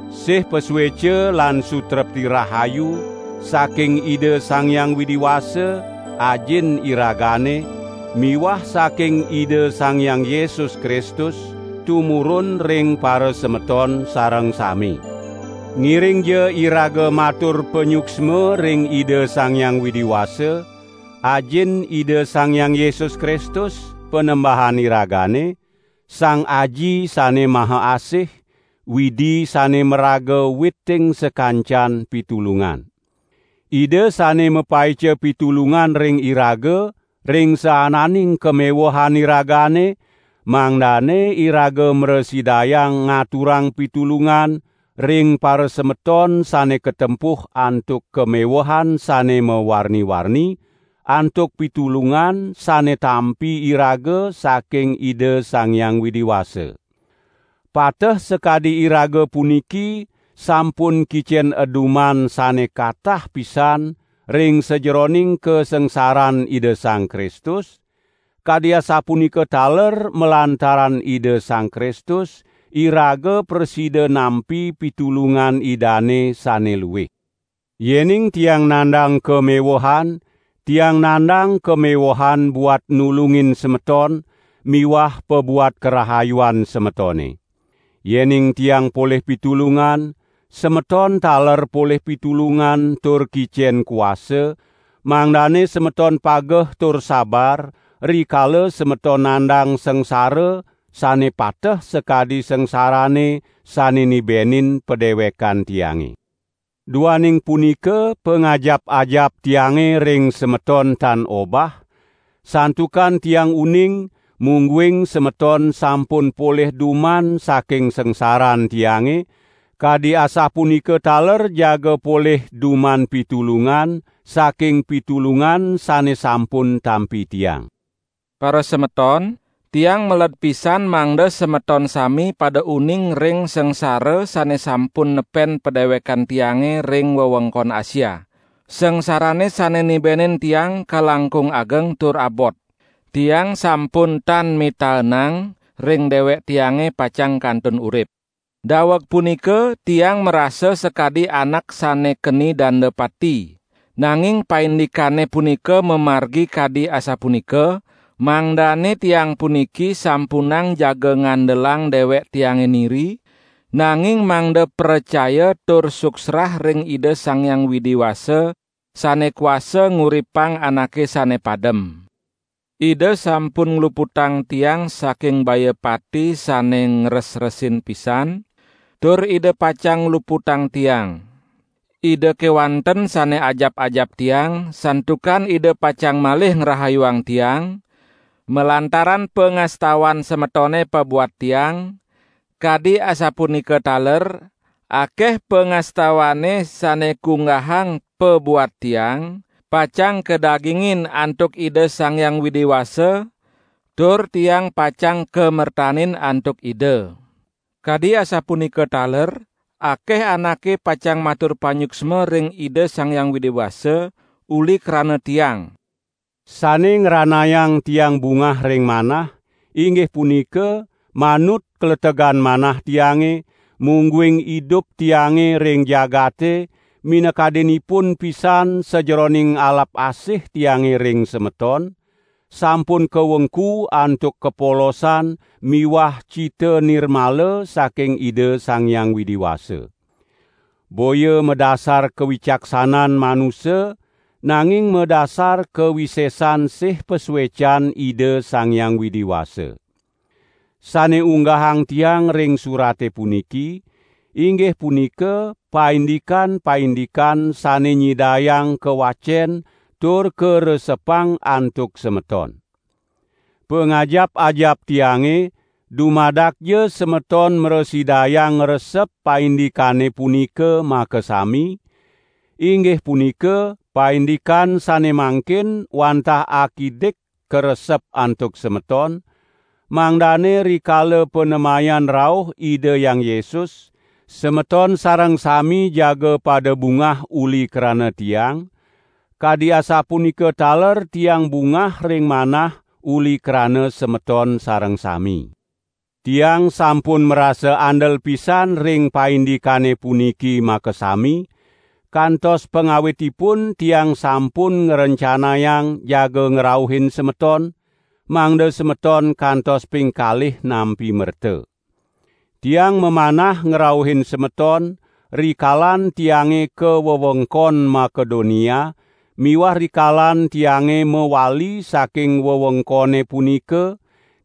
Sih pasueca lan sutrepti rahayu saking Ida Sang Hyang Widi Wasa, Ajin iragane miwah saking Ida Sang Hyang Yesus Kristus tumurun ring parasemeton sareng sami. Ngiringja iraga matur panyuksma ring Ida Sang Hyang Widi Wasa, Ajin Ida Sang Hyang Yesus Kristus, Panembahan iragane, Sang Aji sane mahaasih, Widi sane maraga witing sakancan pitulungan. Ida sane mapaica pitulungan ring iraga ring saananing kamewehan iragane, mangdane iraga mrasidayang ngaturang pitulungan ring parasemeton sane katempuh antuk kamewehan sane mawarni-warni, antuk pitulungan sane tampi iraga saking Ida Sang Hyang Widi Wasa. Pateh sakadi iraga puniki sampun kicen eduman sane katah pisan ring sajeroning kasangsaran Ida Sang Kristus, kadi asapunika taler malantaran Ida Sang Kristus iraga prasida nampi pitulungan Idane sane luih. Yening tiang nandang kamewehan, tiang nandang kamewehan buat nulungin semeton miwah pabuat karahayuan semetone. Yening tiang polih pitulungan, semeton taler polih pitulungan tur kicen kuasa, mangdane semeton pageh tur sabar, rikala semeton nandang sangsara sane pateh sakadi sangsarane sane nibenin padewekan tiange. Duaning punika pangajap-ajap tiange ring semeton tan obah, santukan tiang uning mungguing semeton sampun polih duman saking sangsaran tiange, kadi asapunika taler jaga polih duman pitulungan saking pitulungan sane sampun tampi tiang. Parasemeton, tiang meled pisan mangda semeton sami pada uning ring sangsara sane sampun nepen padewekan tiange ring wewengkon Asia. Sangsarane sane nibenin tiang kalangkung ageng tur abot. Tiang sampun tan mitaenang ring dewek tiange pacang kantun urip. Daweg punika tiang marasa sakadi anak sane keni danda pati. Nanging paindikane punika mamargi kadi asapunika, mangdane tiang puniki sampunang jaga ngandelang dewek tiange niri, nanging mangda pracaya tur suksrah ring Ida Sang Hyang Widi Wasa sane kuasa nguripang anake sane padem. Ida sampun ngluputang tiang saking baya pati sane ngresresin pisan, tur Ida pacang ngluputang tiang. Ida kewanten sane ajap-ajap tiang, santukan Ida pacang malih ngrahayuang tiang, malantaran pangastawan semetone pabuat tiang, kadi asapunika taler, akeh pangastawane sane kunggahang pabuat tiang, pacang kadagingin antuk Ida Sang Hyang Widi Wasa, tur tiang pacang kamertanin antuk Ida. Kadi asapunika taler akeh anake pacang matur panyuksma ring Ida Sang Hyang Widi Wasa uli krana tiang. Sane ngranayang tiang bungah ring manah, inggih punika manut kletegan manah tiange, mungguing idup tiange ring jagate, minakadinipun pisan sajeroning alap asih tiange ring semeton, sampun kawengku antuk kapolosan miwah cita nirmala saking Ida Sang Hyang Widi Wasa. Boya madasar kawicaksanan manusa, nanging madasar kawisesan sih pasuecan Ida Sang Hyang Widi Wasa. Sane unggahang tiang ring surate puniki, inggih punika paindikan-paindikan sane nyidayang kawacen tur karesepang antuk semeton. Pangajap-ajap tiange dumadakja semeton mrasidayang ngresep paindikane punika makasami, inggih punika, paindikan sane mangkin wantah akidik karesep antuk semeton, mangdane rikala panemayan rauh Ida Hyang Yesus, semeton sareng sami jaga pada bungah uli krana tiang, kadi asapunika taler tiang bungah ring manah uli krana semeton sareng sami. Tiang sampun marasa andel pisan ring paindikane puniki makasami, kantos pangawitipun tiang sampun ngrencanayang jaga ngrauhin semeton, mangda semeton kantos pingkalih nampi merta. Tiang mamanah ngrauhin semeton rikalan tiange ka wewengkon Makedonia miwah rikalan tiange mawali saking wewengkone punika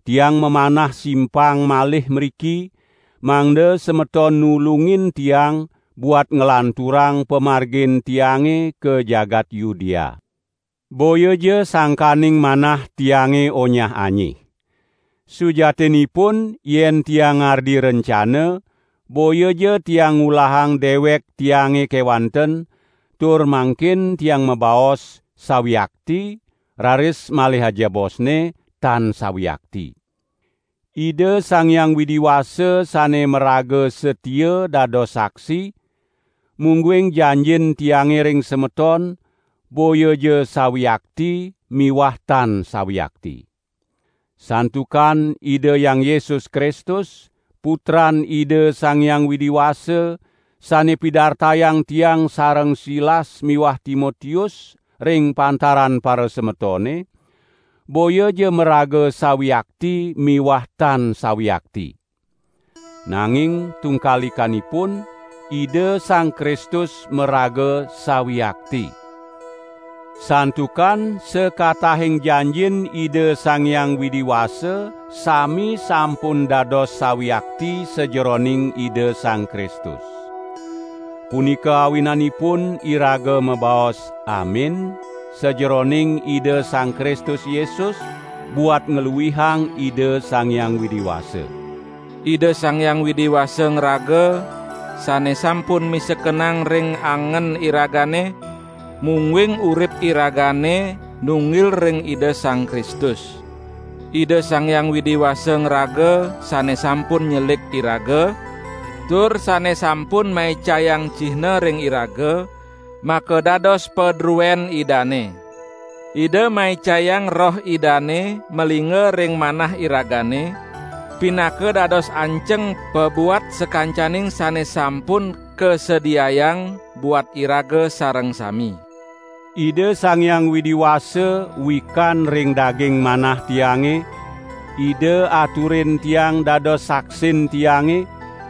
tiang mamanah simpang malih mriki, mangda semeton nulungin tiang buat nglanturang pamargin tiange ka jagat Yudea. Boyaja sangkaning manah tiange onyah-anyih. Sujatinipun yen tiang ngardi rencana, boyaja tiang ngulahang dewek tiange kewanten, tur mangkin tiang mabaos: sawiakti, raris malih ajebosne: tan sawiakti. Ida Sang Hyang Widi Wasa sane maraga satia dados saksi, mungguing janjin tiange ring semeton, boyaja "sawiakti" miwah "tan sawiakti". Santukan Ida Hyang Yesus Kristus, Putran Ida Sang Hyang Widi Wasa, sane pidartayang tiang sareng Silas miwah Timotius ring pantaran parasemetone, boyaja maraga "sawiakti" miwah "tan sawiakti". Nanging tungkalikanipun, Ida Sang Kristus maraga "sawiakti". Santukan sakatahing janjin Ida Sang Hyang Widi Wasa sami sampun dados sawiakti sajeroning Ida Sang Kristus. Punika awinanipun iraga mabaos "Amin", sajeroning Ida Sang Kristus Yesus buat ngluihang Ida Sang Hyang Widi Wasa. Ida Sang Hyang Widi Wasa ngraga sane sampun misekenang ring angen iragane, mungguing urip iragane nunggil ring Ida Sang Kristus. Ida Sang Hyang Widi Wasa ngraga sane sampun nyelik iraga, tur sane sampun maicayang cihna ring iraga makadados padruen Idane. Ida maicayang Roh Idane malingga ring manah iragane, pinaka dados anceng pabuat sakancaning sane sampun kasediayang buat iraga sareng sami. Ida Sang Hyang Widi Wasa wikan ring daging manah tiange, Ida aturin tiang dados saksin tiange,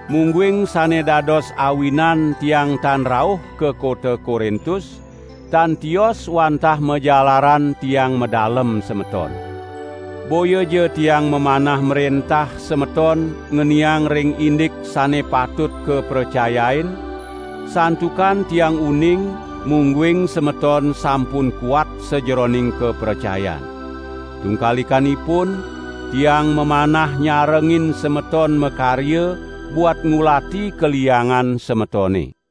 mungguing sane dados awinan tiang tan rauh ka kota Korintus, tan tios wantah majalaran tiang madalem semeton. Boyaja tiang mamanah mrentah semeton ngeniang ring indik sane patut kapracayain, santukan tiang uning mungguing semeton sampun kuat sajeroning kapracayan. Tungkalikanipun, tiang mamanah nyarengin semeton makarya, buat ngulati kaliangan semetone.